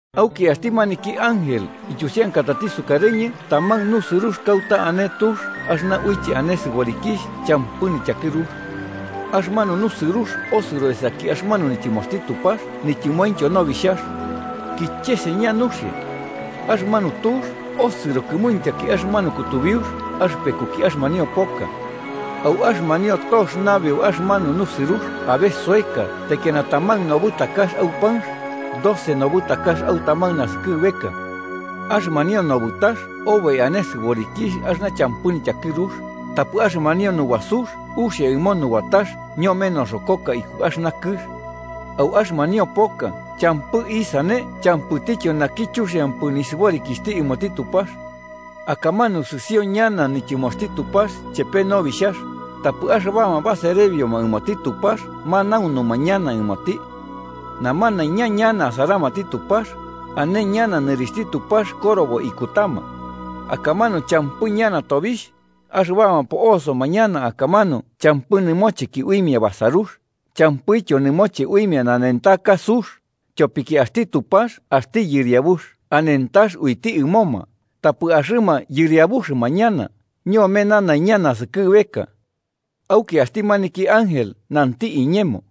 Auki axti maniki ángel ityusiankatati sukarɨñɨ taman nusɨrux kauta ane tux axɨna uiche ane sɨborikixh champɨ nityakɨrux. Axɨmanu nusɨrux osɨro esaki axɨmanu nityɨmoxti Tupax nityɨmointyo Nobixhax. Kicheseña nuxia. Axɨmanu tux osɨro kɨmuintyaki axɨmanu kutubiux axɨpekuki axɨmanio poka. Au axɨmanio tox nabeu axɨmanu nusɨrux abe soeka taikiana taman nobɨtakax au panx, doce nobɨtakax au taman nasɨkɨbeka. Axɨmanio nobɨtax oboi ane sɨborikixh axɨna champɨ nityakɨrux, tapɨ axɨmanio nubasux uxia ɨmo nubatax ñome noxokoka iku axɨna kɨx. Au axɨmanio poka champɨ isane champɨtityo naki chuxiampɨ nisɨborikixhti ɨmoti Tupax. Akamanu sɨsio ñana nityɨmoxti Tupax chepe Nobixhax, tapɨ axɨbama baserebioma ɨmoti Tupax manaunuma ñana ɨmoti. Namanaiña ñana asaramati Tupax, ane ñana nɨrixhti Tupax korobo ikutama. Akamanu champɨ ñana tobixh, axɨbama po'osoma ñana akamanu champɨ nɨmocheki uimia basarux, champɨityo nɨmoche uimia nanentaka sux, tyopiki axti Tupax axti Yɨriabux anentax uiti ɨmoma, tapɨ axɨma yɨriabuxɨma ñana ñome nanaiña naskɨbeka. Auki axti maniki ángel nanti iñemo: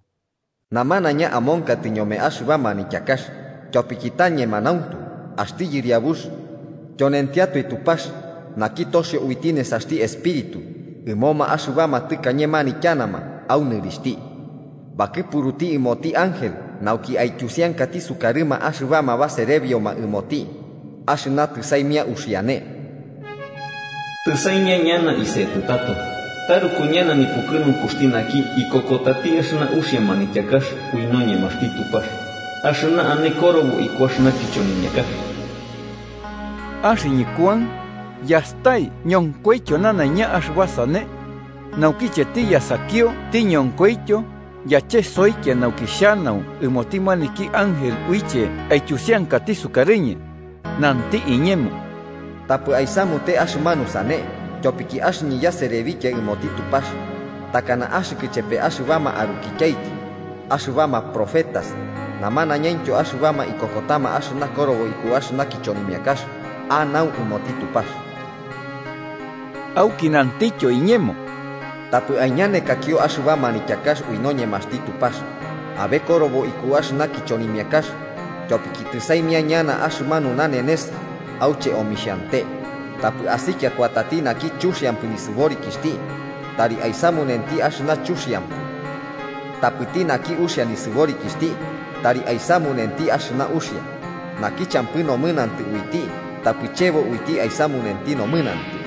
“Namanaiña amonkatɨ ñome axɨba manityakax, tyopiki ta ñemanauntu. Axti Yɨriabux, tyonentiatoe Tupax naki toxio uiti nesaxti Espíritu ɨmoma axɨbama tɨkañe manityanama au nɨrixhti, bakɨpuruti ɨmoti ángel nauki aityusiankati sukarɨma axɨbama baserebioma ɨmoti axɨna tɨsaimia uxiane.” “¡Tɨsaimia ñana isetɨ tato! ¡Taruku ñana nipukɨnunkuxti naki ikokotati axɨna uxia manityakax ui noñemaxti Tupax axɨna ane korobo iku axɨna kichonimiakax!” Axɨñɨ Kuan, yastai ñonkoityo nanaiña axɨba sane. Naukiche tiyasakio tiñonkoityo, yachesoikia nauki xhanau ɨmoti maniki ángel uiche aityusiankati sukarɨñɨ. Nanti iñemo: “Tapɨ aisamute axɨmanu sane, tyopiki axɨñɨ yaserebikia ɨmoti Tupax, takana axɨkɨ chepe axɨbama arukityaiki axɨbama profetas namanaiñaintyo axɨbama ikokotama axɨna korobo iku axɨna kichonimiakax. Anau ɨmoti Tupax.” Auki nantityo iñemo: “Tapɨ aiñanekakio axɨba manityakax ui noñemaxti Tupax abe bokorobo iku axɨna kichonimiakax, tyopiki tɨsaimia ñana axɨmanu nanenes auche omixhante. Tapɨ asikia kuatati naki chuxiampɨ nisɨborikixhti tari aisamunenti axɨna chuxiampɨ. Tapɨti naki uxia nisɨborikixhti tari aisamunenti axɨna uxia, naki champɨ nomɨnantɨ uiti tapɨ chebo uiti aisamunenti nomɨnantɨ.”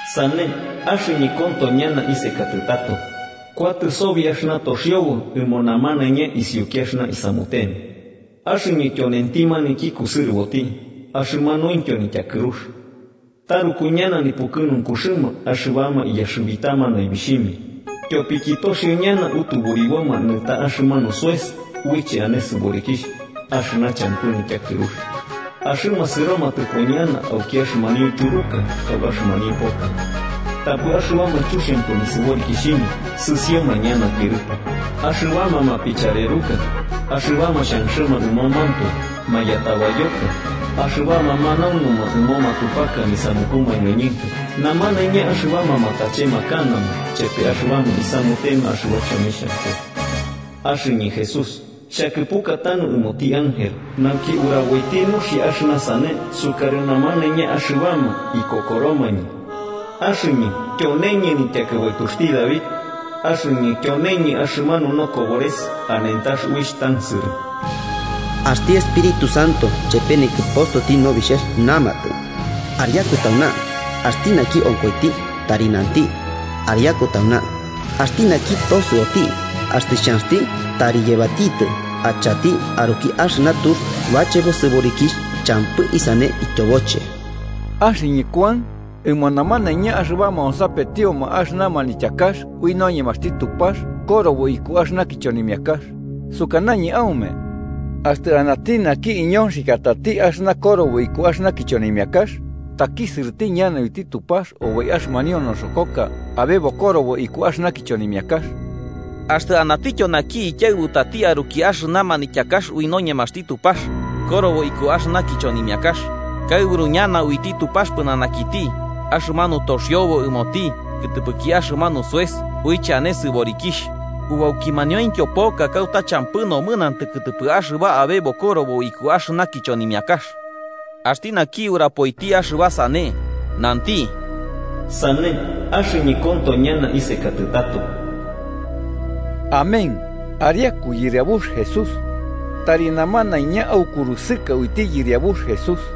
“Sane, axɨñɨ konto ñana isekatɨ tato, kuatɨ sobi axɨna toxiobo sobi ɨmo namanaiña isiuki axɨna isamutema. Axɨñɨ tyonenti maniki kusɨrɨboti, axɨmanuintyo nityakɨrux.” Taruku ñana nipukɨnunkuxɨma axɨbama iyaxɨbitama naibixhimia, tyopiki toxio ñana utuburiboma nɨta axɨmanu soes uiche ane sɨborikixh axɨna champɨ nityakɨrux. Axɨma sɨromatɨpo ñana auki axɨmanio tyuruka au axɨmanio poka. Tapɨ axɨbama chuxiampɨ nisɨborikixhimia sɨsioma ñana tyɨrɨpo, axɨbama mapichareruka, axɨbama xhanxɨma ɨmomantoe, mayatabayoka, axɨbama manaunuma ɨmo matupaka nisamuku mañoñɨnka namanaiña axɨbama matachemakanama chepe axɨbama isamutema axɨba chomixhampɨ. “Axɨñɨ Jesús, xhakɨpuka tanu ɨmoti ángel nauki uraboiti nuxia axɨna sane sukarɨ namanaiña axɨbama ikokoromañɨ. Axɨñɨ tyoneñɨ nityakɨbaituxti David. Axɨñɨ tyone axɨmanu nokobores anentax uixh tansɨrɨ.” Axti Espíritu Santo chepe nikɨpostoti Nobixhax namatɨ: “¡Ariaku tauna!” Axti naki onkoiti, tari nanti: “¡Ariaku tauna!” Axti naki tosɨoti, axtɨ xhanxti, tari yebatitɨ achati aruki axɨna tux bachebo sɨborikixh champɨ isane ityoboche. Axɨñɨ Kuan, ɨmo namanaiña axɨbama onsapetioma axɨna manityakax ui noñemaxti Tupax korobo iku axɨna kichonimiakax, sukanañɨ aume: Axtɨ anati naki iñonxikiatati axɨna korobo iku axɨna kichonimiakax, takisɨrɨti ñana uiti Tupax oboi axɨmanio noxokoka abe bokorobo iku axɨna kichonimiakax. Axtɨ anatityo naki ikiaɨbutati aruki axɨna manityakax ui noñemaxti Tupax korobo iku axɨna kichonimiakax, kaɨburu ñana uiti Tupax pɨnanakiti axɨmanu toxiobo ɨmoti kɨtɨpɨki axɨmanu soes uiche ane sɨborikixh aukimanauintyo poka kauta champɨ nomɨnantɨ kɨtɨpɨ axɨba abe bokorobo iku axɨna kichonimiakax. Axti naki urapoiti axɨba sane, nanti: “Sane, axɨñɨ konto ñana isekatɨ tato.” Amén. ¡Ariaku, Yɨriabux Jesús! Tari namanaiña aukurusɨka uiti Yɨriabux Jesús.